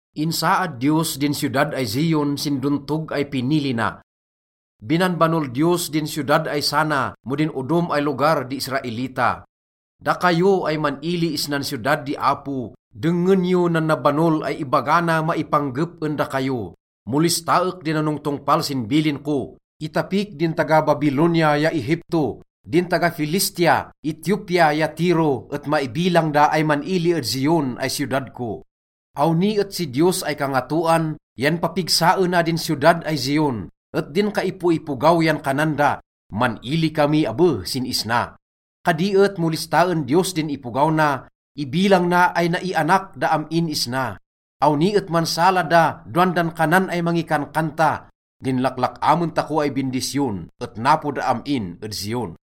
Insaad Diyos din siyodad ay Zion sin dontog ay pinili na. Binanbanol Diyos din siyodad ay sana mo din odom ay lugar di Israelita. Dakayo ay man-ili isnan siyodad di Apo dengngen yo, nan nabanol ay ibaga na maipanggep en dakayo: “Mo listaek di nanongtongpal sin bilin ko, itapik din taga-Babilonia ya Egipto. Din taga-Filistia, Etiopia ya Tiro et maibilang da ay man-ili ed Zion ay siyodad ko.” Awni et si Diyos ay Kangatoan yan papigsaena din siyodad ay Zion, et din kaipoipogaw yan kanan da, “Man-ili kami abe sin isna.” Kadi et mo listaen Diyos din ipogaw na, ibilang na ay naianak da am-in isna. Awni et mansala da dowan dan kanan ay mangikankanta, “Din laklak-amen tako ay bindisyon et napo da am-in ed Zion.”